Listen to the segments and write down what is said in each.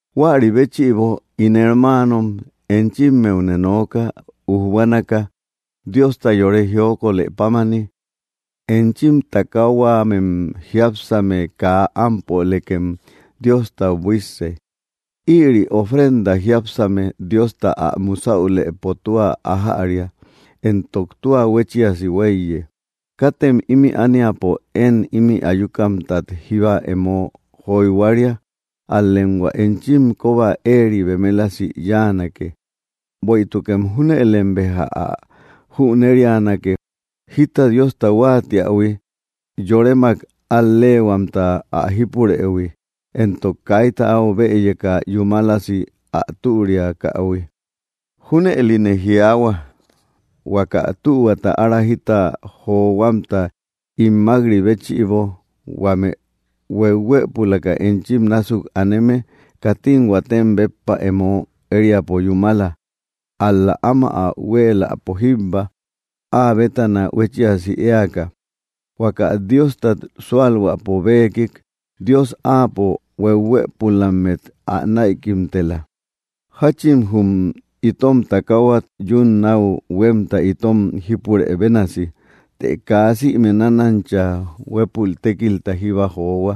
Huäri béchïbo, ín hermaanom, enchimmeune nooka, ujbuanaka, Diosta yore jiokolë pámani: Enchim takahuamem jiápsame kaa ámpolekem Diostau buísse. Ïri ofrenda jiápsame Diosta ä musäulëpo tua ájäria, entok tua huéchiasi huéiye. Katem ímï ániapo én imï ayukamtat jíba emo joyhuaria; ál‑lem hua enchim kóba éeri bemelasi yáanake. Bueïtukem júnëlem beja ä jüneríanake, jita Diosta huáatiähui, yoremak al‑leehuamta ä jípurëhui, éntok kaita áu bëyeka yúmalasi ä türiakähui. Júnëline jiaahua, huaka tühuata ára jita johuamta ín mák‑ri béchïbo, huame hueuhuëpulaka enchim násuk aneme, katim huatem béppa emo ériapo yúmala, ál‑la áma ä huéeläpo jíbba, áa bétana huéchiasi éaka, huaka Diostat súalhuäpo beekik, Dios Áapo hueuhuëpulammet ä näikimtela. Jáchin jum itom takaahuat yún náu huémta itom jípure bénasi, të kaa sïme nánancha huépul tékilta jíba johua.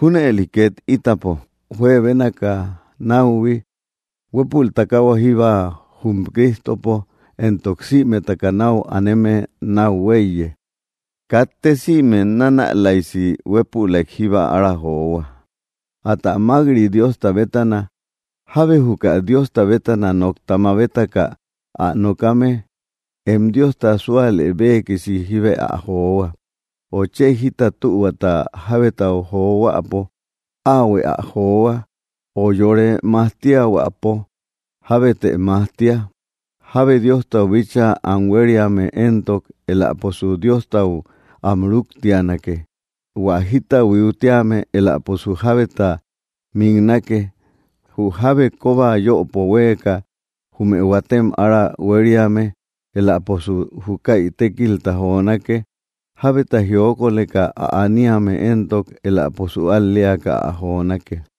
Júnëli két ítapo juebénaka náuhui, huépul takaahua jíbba jum Cristopo, entok sïmetaka náu aneme náu huéiye. Katte sïme nanälaysi huépülaik jíba ára johua; atä mák‑ri Diosta bétana. Jábe juka Diosta bétana nokta mabetaka ä nokame, em Diosta súalë beekisi jíbe ä johua. Ö chë jita tühuata jábetau johuäpo, áahuë ä johua; ö yore majtiahuäpo, jábetë majtia. Jábe Diostau bíchaa am huériame éntok, eläposu Diostau am rúktianake; hua jita huiutíame, eläposu jábeta miknake; jü jábe kóba yöpo huéeka jume huatem ára huériame, eläposu júkäi tékilta jonake; jábeta jiokolëka ä aniame éntok, eläposu al‑leaka ä jonake.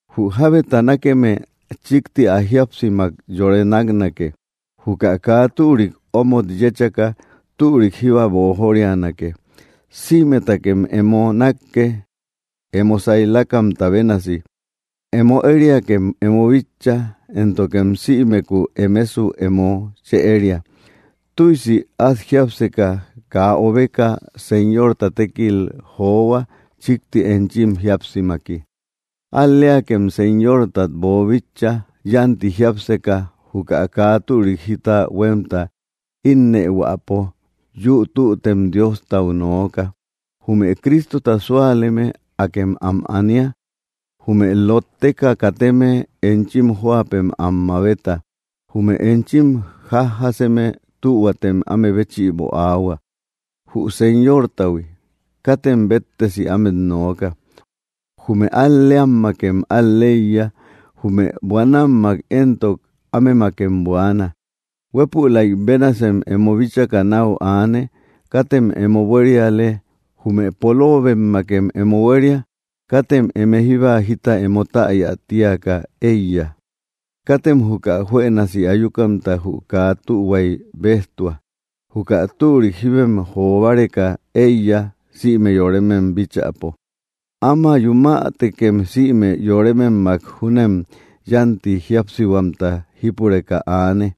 Jü jábeta nákeme chíkti ä jíapsimak yore náknake. Juka kaa türik omot yéchaka, türik jíba boojorianake. Sïmetakem emo nákke, emo saylakamta bénasi: Emo ériakem emo bitcha, éntokem sïmeku emesu emo chë éria. Tüisi át jiápseka, kaa obeka, Señorta tékil johua chikti enchim jíapsimaki. Al‑leakem Señortat boobíchaïhui; yánti jiápseka juka kaa türik jita huémta ínnëhuäpo, yüu tüttem Diostau nooka. Jume Cristota súaleme, akem am ania; jume lótteka kateme enchim jóapem am mabeta. Jume enchim jájjaseme, tühuatem áme béchïbo aahua, jü Señortahui; katem béttesi ámet nooka. Jume al‑leammakem al‑leiya; jume buanammak éntok, ámemakem buaana. Huépülay bénasem emo bíchaka náu aane; katem emo buériale; jume poloobemmakem emo huéria; katem eme jíba jita emo täya tíaka éiya. Katem juka juënasi ayukamta jü kaa tühuay béjtua; juka türik jíbem jo báreka éiya, sïme yoremem bíchäpo. Ama yumätekem sïme yorememmak júnem yánti jíapsihuamta jípureka aane.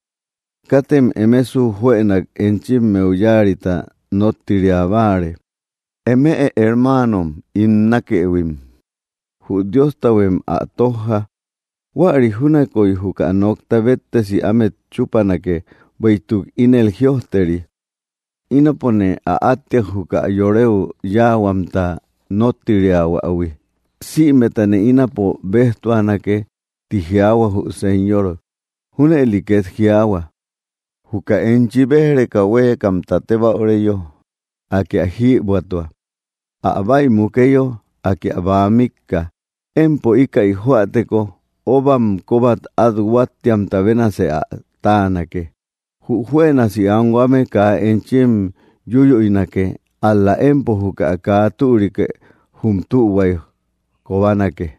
Katem emesu juënak enchimmeu yáarita nóttiria báare. Eme hermaanom ín nákëhuim, jü Diostahuem ä tójja. Huäri júnakoy juka nokta béttesi ámet chúpanake, bueïtuk ínel jïojteri: “Ínapone ä áttia, juka yoreu yáahuamta nóttiriahuahui; sïmetane ínapo béjtuanake, ti jiaahua jü Señor.” Júnëli ket jiaahua: “Juka enchi béj‑reka huéekamta tébäureyo, Akë ä jïbuätua; ä bäi mukeyo, Akë ä bäa mikka. Empo íkäi joäteko, óbam kóbat át huáttiamta bénasë ä táanake.” Jü juënasi anhuame kaa enchi yúyüinake; ál‑la empo juka kaa türikë jü tühuay kobanake.